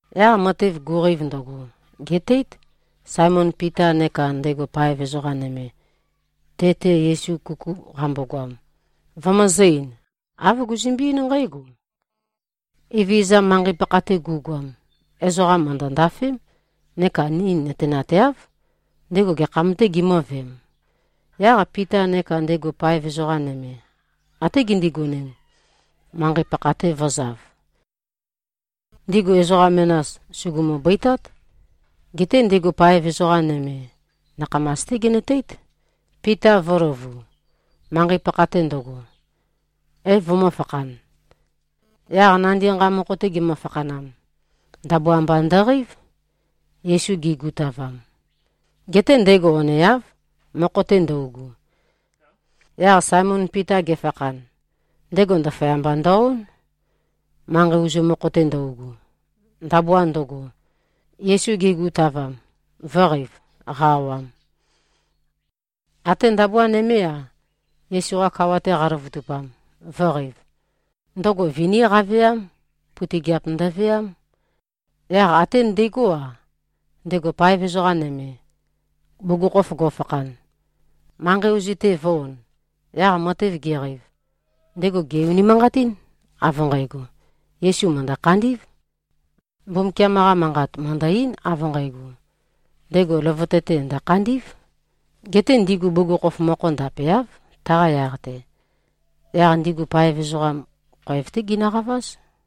Yaq matev guqeiv ndøgo, gètéit, Saemon Pita neka ndego paev ezoqa nøme, te-te Yesu kuku qambogoam, vømøzø̄-ein. Āv guzømbe-eín nqǽgo, “Evezøza, manqei-pakha-te gu꞉goam, ezoqa mø̀ndøndafém. Neka ni nøtenateáv, ndego gekham-tē gimø̄veem.” Yaq Pita neka ndego paev ezoqa nøme, até gindigonem, manqei-pakha-te vø̄zav. Ndigu ezoqa menas, sùgumu-bøitát. Geté ndego paev ezoqa nøme, nakhamas-té genøteít, Pita vø̄løvu, manqei-pakha-te ndøgo, é-vømø̄fakhan. Yaq nandi nqa mokho-te gemø-fakhanam, ndabua mba ndøqeív, Yesu ge꞉gutavam. Geté ndego oneáv, mokho-te ndøugu. Yaq Saemon Pita gefakhan, ndego ndaføyamba ndø-ón, manqei ozu mokho-te ndøugu, ndabua ndøgo, Yesu ge꞉gutavam, vø̄qeiv, qa-awam. Até ndabua nømé-a, Yesu-qa kawa-te qaløvøtupam, vø̄qeiv. Ndøgo viní qaveám. Putøgiap ndøveám. Yaq até ndegó-a, ndego paev ezoqa nøme, bugukhokhof go꞉fakhan, manqei ozu-te vø̄-on. Yaq matev geqeiv, ndego gè-unimanqatín, av nqægo, Yesu mø̀ndø-khandí꞉v. Mbumbukiam-qa Manqat mø̀ndø-eín, av nqægo, ndego løvøte-te ndø̀khandí꞉v. Geté ndigu bugukhokhof mokho ndapeáv, taqa yaq-te. Yaq ndigu paev ezoqam, khoev-té ginøqaváz.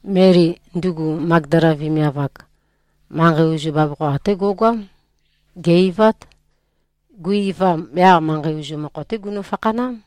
Meli, ndugu Magdala vemiav-ak, manqei ozu bavokho até go꞉goám. Gè-eivát. Gui-eivam, yaq manqei ozu mokho-té gunø-fakhanám.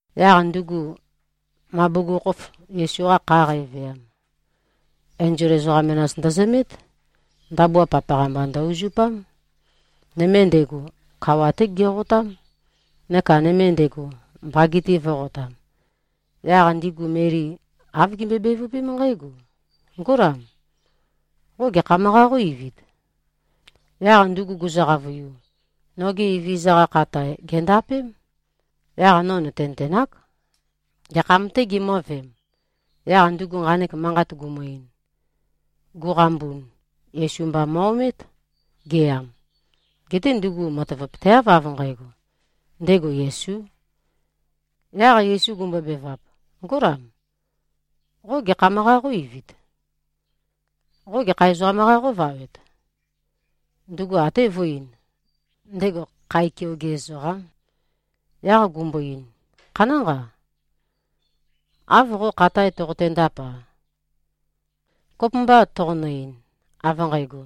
Yaq ndugu, ma bugukhokhof Yesu-qa kha qæveam, enzol ezoqa menas ndøzømét. Ndabua papaqa-mba ndø-uzupám. Nøme ndego, kawa-té geqotám, neka nøme ndego, mbage-te vø̄qotam. Yaq ndigu Meli āv gimbøe-bevøpém nqǽgo, “Ngólam. Qo gekham-qā qó-eivit?” Yaq ndugu guzø-qavøiu, “Noge Evezøza-qa khatae, gèndapém. Yaq no nø̀tenøtenák, gekham-tē gimø̄veem.” Yaq ndugu nqanek manqat gumu-ein, guqambun, Yesu mba mo꞉-omét, geyam. Geté ndugu matavapøteáv, av nqægo, ndego Yesū. Yaq Yesu gumbobevap, “Ngólam. Qo gekham-qā qó-eivit? Qo gekha ezoqam-qā qóvawet?” Ndugu até vø̄e-ein, ndego khae keoge ezoqám. Yaq gumbo-ein, “Khanánqa, av qo khatae toqotendap-a, kopømbâ toqonø-ein, av nqægo,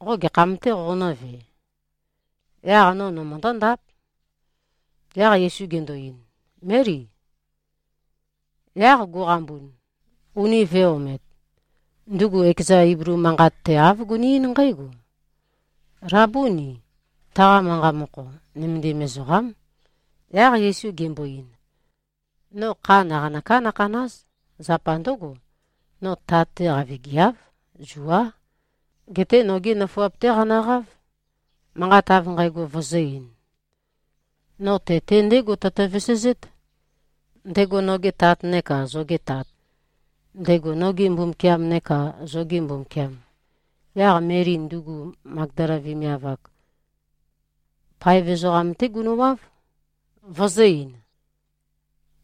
qo gekham-tē qonǿve? Yaq no nømøndó-ndáp.” Yaq Yesu gendo-ein, “Meli!” Yaq guqambun, uni vø̄e-omet, ndugu ekeza Iblu manqat-te āv guni-eín nqǽgo, “Labúni!” Taqa manqa mokho, “Nømendim ezoqám.” Yaq Yesu gembo-ein, “No kha naqanøká nøkhàna᷄z. Zapa ndǿgo, no Tat-te qavigiáv. Zuá. Geté nogi nøfuap-té qanøqáv, manqat av nqægo vøzø̄-ein: No te-te ndégo tøtø-vesezét, ndego noge Tat neka zoge Tat, ndego noge Mbumbukiam neka zoge Mbumbukiam.” Yaq Meli, ndugu Magdala vemiav-ak, paev ezoqam-té gunøwáv, vøzø̄-ein,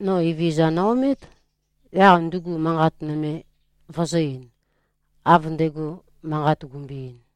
“No Evezøza no-omét.” Yaq ndugu manqat nøme vøzø̄-ein, av ndego manqat gumbøe-ein.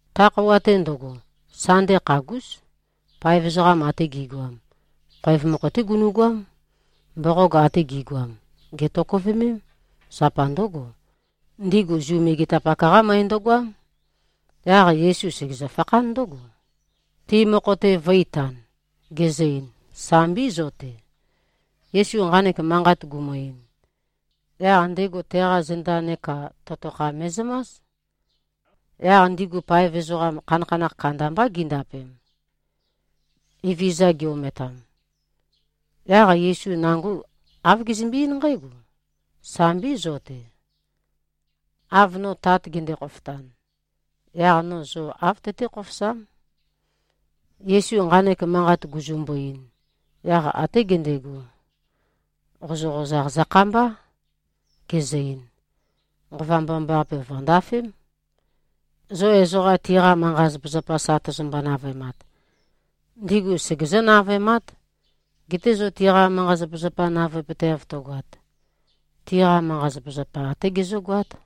Ta khøuwa-te ndøgo, Sande khagús, paev ezoqa ate gi꞉goam, khoev mokho-té gunu꞉goám. Mboqog ate gi꞉goam gètokøvemém. Zapa ndǿgo, ndigu Zu megetapak-qá møe ndøgoám. Yaq Yesu segezø-fakhán ndǿgo, ti mokho-te vø̄-itan, gezø-ein, “Sambí, zo-te.” Yesu nqanek manqat gumu-ein, yaq ndego teqa zenda neka totokha me꞉zømás. Yaq ndigu paev ezoqam, khanakhanakh kandambá gindapem, Evezøza gi-ometam. Yaq Yesu nango āv gezømbe-eín nqǽgo, “Sambí, zo-te. Av no Tat gende-khofotan, yaq no zo āv tøté-khofosám.” Yesu nqanek manqat guzumbu-ein, yaq até gendego, qozøqozaq zøkhambá, gezø-ein, “Nqova Mbomambaqape vø̀ndafém. Zo ezoqa tiqa manqa-zapazapa sa tøzømbo-navøemat, ndigu segezǿ-navøemát. Geté zo tiqa manqa-zapazapa navøepøteav tøgoat, tiqa manqa-zapazapa, até gezǿgoát.”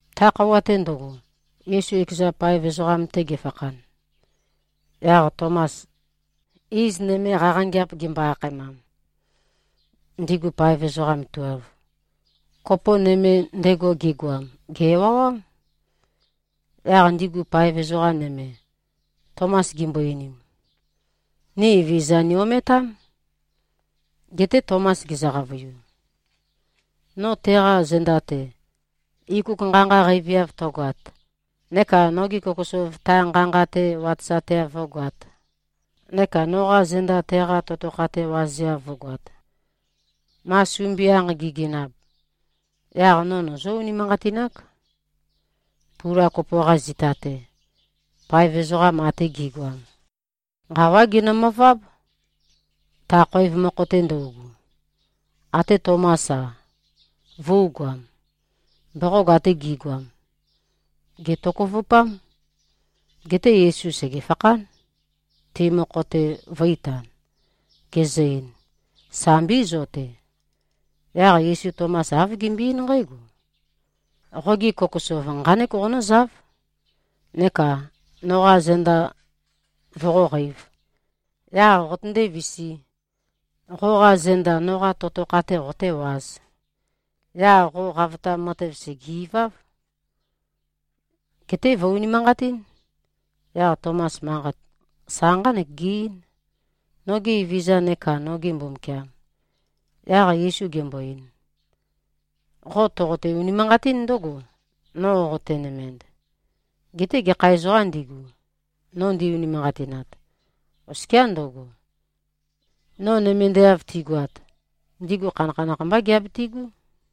Ta khøuwa-te ndøgo, Yesu ekeza paev ezoqam-te gefakhan, yaq Tomas, iz nøme qaqangeap gimbo-akhaemam, ndigu paev ezoqa tuelv, kopo nøme ndego gegoam, gè-ewawám. Yaq ndigu paev ezoqa nøme, Tomas gimbo-einim, “Ni Evezøza ni-ometám.” Geté Tomas gezø-qavøiu, “No teqa zenda-te, ikuk nqa-nqa qeiviav tøgoat, neka nogi kokosov ta nqa-nqa-te watøzateav vǿgoāt, neka noqa zenda teqa totokha-te wazeav vǿgoāt, ma sumbianq gigenab, yaq no nøzǿ-unimanqatinák.” Pula kopo-qa zita-te, paev ezoqa ate gi꞉goam, nqawá ginømøváb, ta khoev mokho-te ndøugu. Até Tomás-a, vø̄ugoam. Mboqog ate gi꞉goam gètokøvupám. Geté Yesu sègefakhán, ti mokho-te vø̄-itan. Gezø-ein, “Sambí, zo-te.” Yaq Yesu Tomas āv gembøe-eín nqǽgo, “Qogi kokosov nqánek qonǿzáv, neka noqa zenda voqóqeīv. Yaq qotøndé-visī, qoqa zenda noqa totokha-te qotéwāz. Yaq qo qavotam matev sège-iváv. Geté vø̀-unimanqatín.” Yaq Tomas manqat sa nqánek ge-eín, “Noge Evezøza neka noge Mbumbukiam.” Yaq Yesu gembo-ein, “Qo toqote-unimanqatín ndǿgo, no qotenømend. Geté gekha ezoqām ndigu, no ndi-unimanqatinat, oskiá ndøgo, no nømendeav tigoat, ndigu khanakhanakh mbá giabitigú.”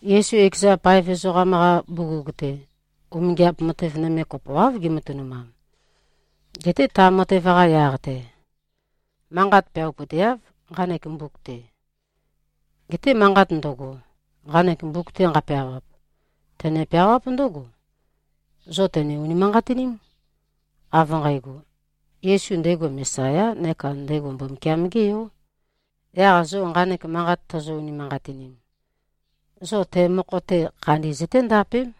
Yesu ekeza paev ezoqam-qa bugug-te, umingiap matev nøme kopoáv gematønumam. Geté ta matev-qa yaq-te, manqat peawapøteáv, nqanek mbuk-te. Geté manqat ndøgo, nqanek mbuk-te nqapeawap, tøne-peawáp ndǿgo, zo tøne-unimanqatiním, av nqægo, Yesu ndego Mesayá neka ndego Mbumbukiam-gé Yó. Yaq zo nqanek manqat tozo-unimanqatinim, zo te mokho-te khandi zøténdapém.